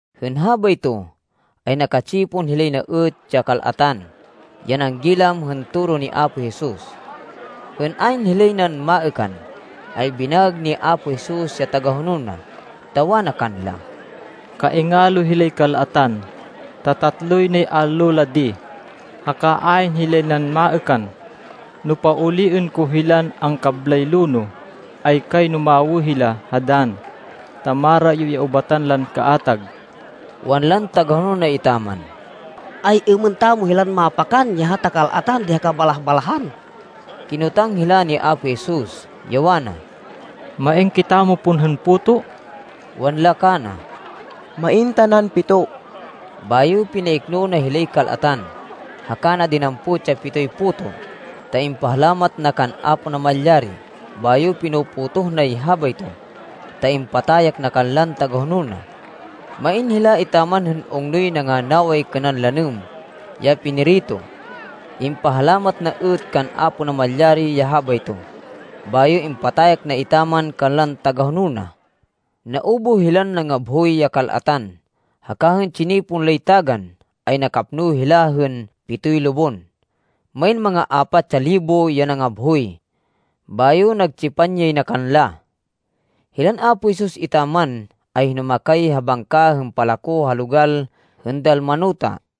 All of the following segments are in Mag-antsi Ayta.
Hên habayto, ay naka-tsipon hilay na êt ya kal-atan ya nanggilam hên toro ni Apo Jesus. Hên ayn hilay nan maêkan, ay binaêg ni Apo Jesus ya tagahonol na, ta wana kanla, “Kaingalo hilay kal-atan, ta tatloy nay allo la di, haka ayn hilay nan maêkan. No pauliên ko hilan angkablay lonoh, ay kayno mawê hila ha dann, ta marayo ya ubatan lan kaatag.” Wanlan tagahonol na etaman, “Ay-êmên tamo hilan mapakan ya hata kal-atan di ha kabalah-balahan?” Kinotang hila ni Apo Jesus, ya wana, “Main kitamo pon hên puto?” Wanla kana, “Main tanan pito.” Bayo pinaikno na hilay kal-atan, haka na dinampot ya pitoy puto, ta impahalamat na kan Apo Namalyari, bayo pino-potoh nay habayto, ta impatayak na kanlan tagahonol na. Main hila etaman hên ungnoy nanganaway kênan lanêm ya pinirito. Impahalamat na êt kan Apo Namalyari ya habayto, bayo impatayak na etaman kanlan tagahonol na. Naubuh hilan nangabhoy ya kal-atan, haka hên tsinipon lay tagan, ay nakapno hila hên pitoy lubon. Main manga apat ya libo ya nangabhoy. Bayo nagtsipan yay na kanla. Hilan Apo Jesus etaman, ay hinumakay ha bangka hên palako ha logal hên Dalmanuta.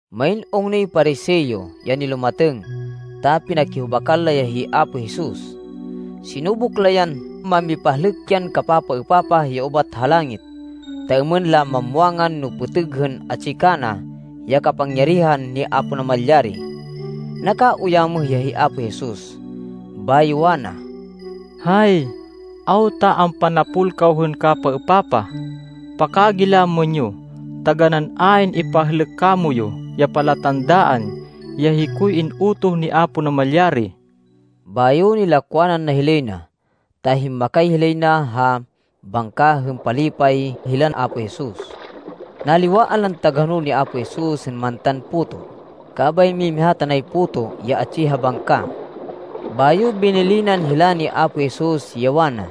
Main ungnoy Pariseo ya nilumatêng, ta pinakihubakan la ya hi Apo Jesus. Sinubuk la yan mamipahlêk yan kapapaêpapah ya ubat ha langit, ta êmên la mamwangan no pêtêg hên atsi kana ya kapangyarihan ni Apo Namalyari. Nakauyamêh ya hi Apo Jesus, bayo wana, “Hay! Awta ampanapol kaw hên kapapaêpapah! Pakagilamên yo! Taganán ayn ipahlêk kamoyu ya palatandaan ya hikoy in-utoh ni Apo Namalyari!” Bayo nilakwanan na hilay na, ta himmakay hilay na ha bangka hên palipay hilan Apo Jesus. Naliwaan lan tagahonol ni Apo Jesus hên mantan puto, kabay mimiha tanay puto ya atsi ha bangka. Bayo binilinan hila ni Apo Jesus ya wana,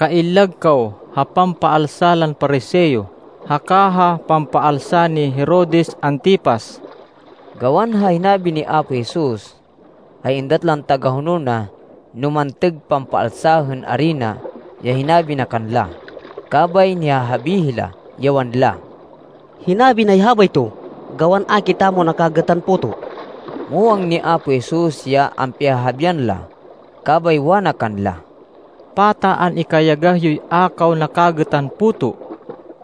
“Kaillag kaw ha pampaalsa lan Pariseo haka ha pampaalsa ni Herodes Antipas.” Gawan ha hinabi ni Apo Jesus, ay êndat lan tagahonol na no mantêg pampaalsa hên arina ya hinabi na kanla, kabay nihahabi hila, ya wanla, “Hinabi nay habayto gawan a kitamo nakagêtan puto.” Muwang ni Apo Jesus ya ampihahabian la, kabay wana kanla, “Pata an-ikayagah yoy a kaw nakagêtan puto!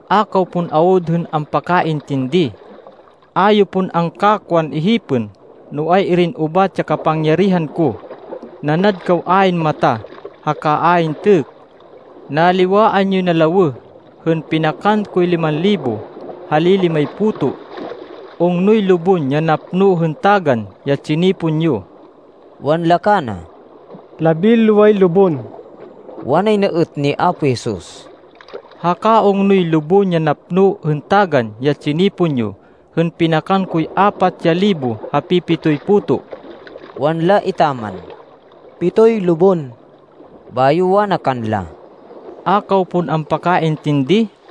A kaw pon awud hên ampakaintindi! A yo pon angkakwan ihipên no ay-irin ubat ya kapangyarihan ko! Nanad kaw ayn mata, haka ayn têkk! Naliwaan yoy na lawêh hên pinakan koy liman libo ha li-limay puto! Ungnoy lubon ya napno hên tagan ya tsinipon yo?” Wanla kana, “Labinloway lubon.” Wanay na êt ni Apo Jesus, “Haka ungnoy lubon ya napno hên tagan ya tsinipon yo hên pinakan koy apat ya libo ha pi-pitoy puto?” Wanla etaman, “Pitoy lubon.” Bayo wana kanla, “A kaw pon ampakaintindi?”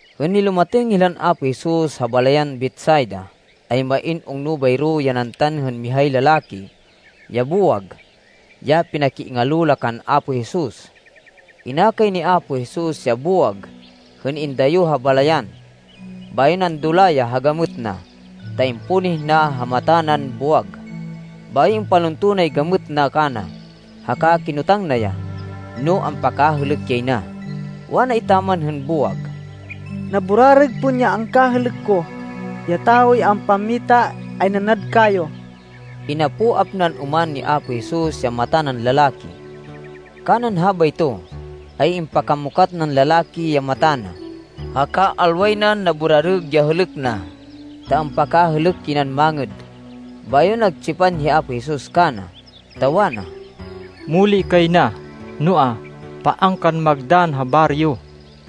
Hên nilumatêng hilan Apo Jesus ha balayan Betsaida, ay main ungno bayro ya nantan hên mihay lalaki ya buwag, ya pinakiingalo la kan Apo Jesus. Inakay ni Apo Jesus ya buwag hên indayo ha balayan. Bayo nandula ya ha gamêt na, ta impunih na ha mata nan buwag, bayo impalunto nay gamêt na kana, haka kinotang na ya, no ampakahêlêk yay na. Wana etaman hên buwag, “Naburarêg pon ya angkahêlêk ko, ya tawoy ampammita, ay nanad kayo.” Inapoap nan oman ni Apo Jesus ya mata nan lalaki. Kanan habayto, ay impakamukat nan lalaki ya mata na, haka alway nan naburarêg ya hêlêk na, ta ampakahêlêk yay nan mangêd. Bayo nagtsipan hi Apo Jesus kana, ta wana, “Muli kay na, noa, paan kan magdann ha baryo.”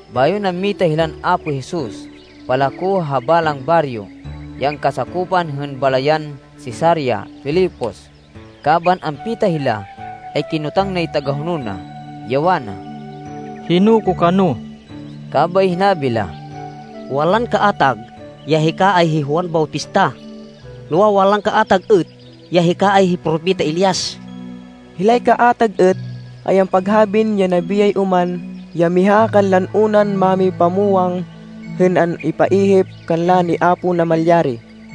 Bayo nammita hilan Apo Jesus palako ha balang baryo ya angkasakopan hên balayan Cesarea Filipos. Kaban ampita hila, ay kinotang nay tagahonol na, ya wana, “Hino ko kano?” Kabay hinabi la, “Wanlan kaatag ya hika ay hi Juan Bautista. Noa, wanlan kaatag êt ya hika ay hi Propeta Elias. Hilay kaatag êt ay ampaghabin ya nabiyay oman ya miha kanlan unan mámipamwang hên an-ipaihip kanla ni Apo Namalyari.”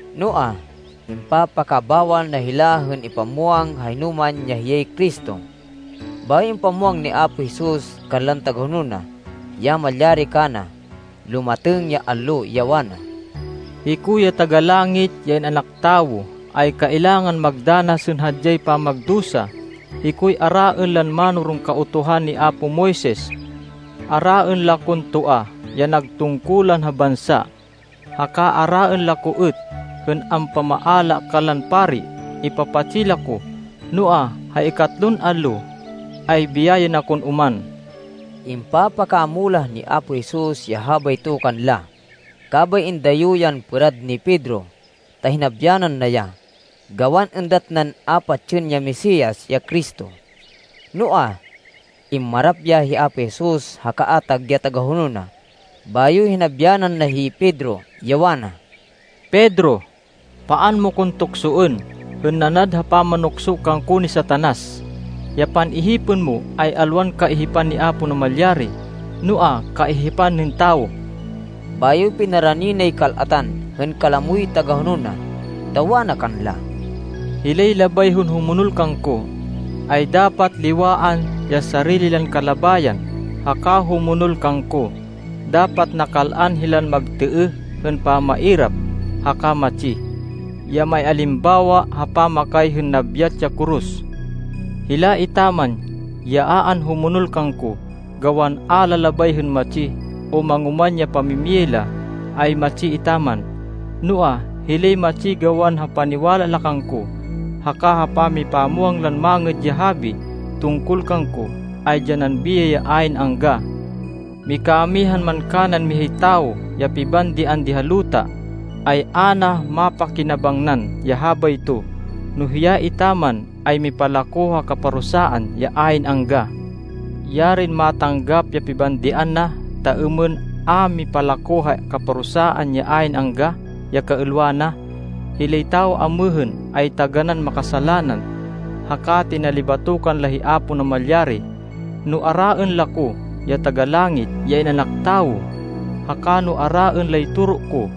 Noa, impapakabawal na hila hên ipamwang ha hinoman ya hiyay Cristo. Bayo impamwang ni Apo Jesus kanlan tagahonol na, ya malyari kana lumatêng ya allo, ya wana, “Hiko ya Taga-Langit, ya In-anak Tawo, ay kailangan magdanas hên hadyay pamagdusa. Hikoy araên lan mánoron Kautuhan ni apo Moises. Araên la kon toa ya nag tungkulan ha bansa, haka araên la ko êt hên ampamaala kanlan pari. Ipapatsi la ko, noa, ha ikatlon allo ay biyayên akon oman.” Impapakamulah ni Apo Jesus ya habayto kanla. Kabay indayo yan pêrad ni Pedro ta hinabyanan na ya, gawan êndat nan a patsên ya Mesias, ya Cristo. Noa, immarap hi Apo Jesus ha kaatag ya tagahonol na, bayo hinabyanan na hi Pedro, ya wana, “Pedro, paan mo kon tuksoên hên nanad ha pamanukso kangko ni Satanas! Ya pan-ihipên mo ay alwan kaihipan ni Apo Namalyari, noa, kaihipan hên tawo!” Bayo pinarani nay kal-atan hên kalamoy tagahonol na, ta wana kanla, “Hilay labay hên humonol kangko, ay dapat liwaan ya sarili lan kalabayan haka humonol kangko. Dapat nakal-an hilan magtêêh hên pamairap haka matsi, ya maialimbawa ha pamakay hên nabyat ya koros. Hila etaman ya a anhumonol kangko, gawan a la labay hên matsi o mangoman ya pamimiyay la, ay matsi etaman. Noa, hilay matsi gawan ha paniwala la kangko haka ha pamipamwang lan Mangêd ya Habi tungkol kangko, ay dyanan biyay ya ayn angga. Mikamihan man kanan mihay tawo ya pibandian di ha luta, ay a na mapakinabangnan ya habayto, no hiya etaman ay mipalako ha kaparusaan ya ayn angga! Yarin matanggap ya pibandian na, ta êmên a mipalako ha kaparusaan ya ayn angga ya kaêlwa na! Hilay tawo amêhên ay taganán makasalanan, haka tinalibatokan la hi Apo Namalyari. No araên la ko, ya Taga-Langit, ya In-anak Tawo, haka no araên lay toro ko,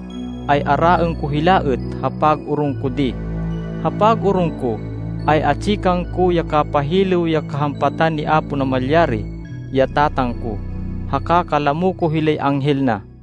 ay araên ko hila êt ha pag-orong ko di. Ha pag-orong ko, ay atsi kangko ya kapahilêw ya kahampatan ni Apo Namalyari, ya Tatang ko, haka kalamo ko hilay anghel na.”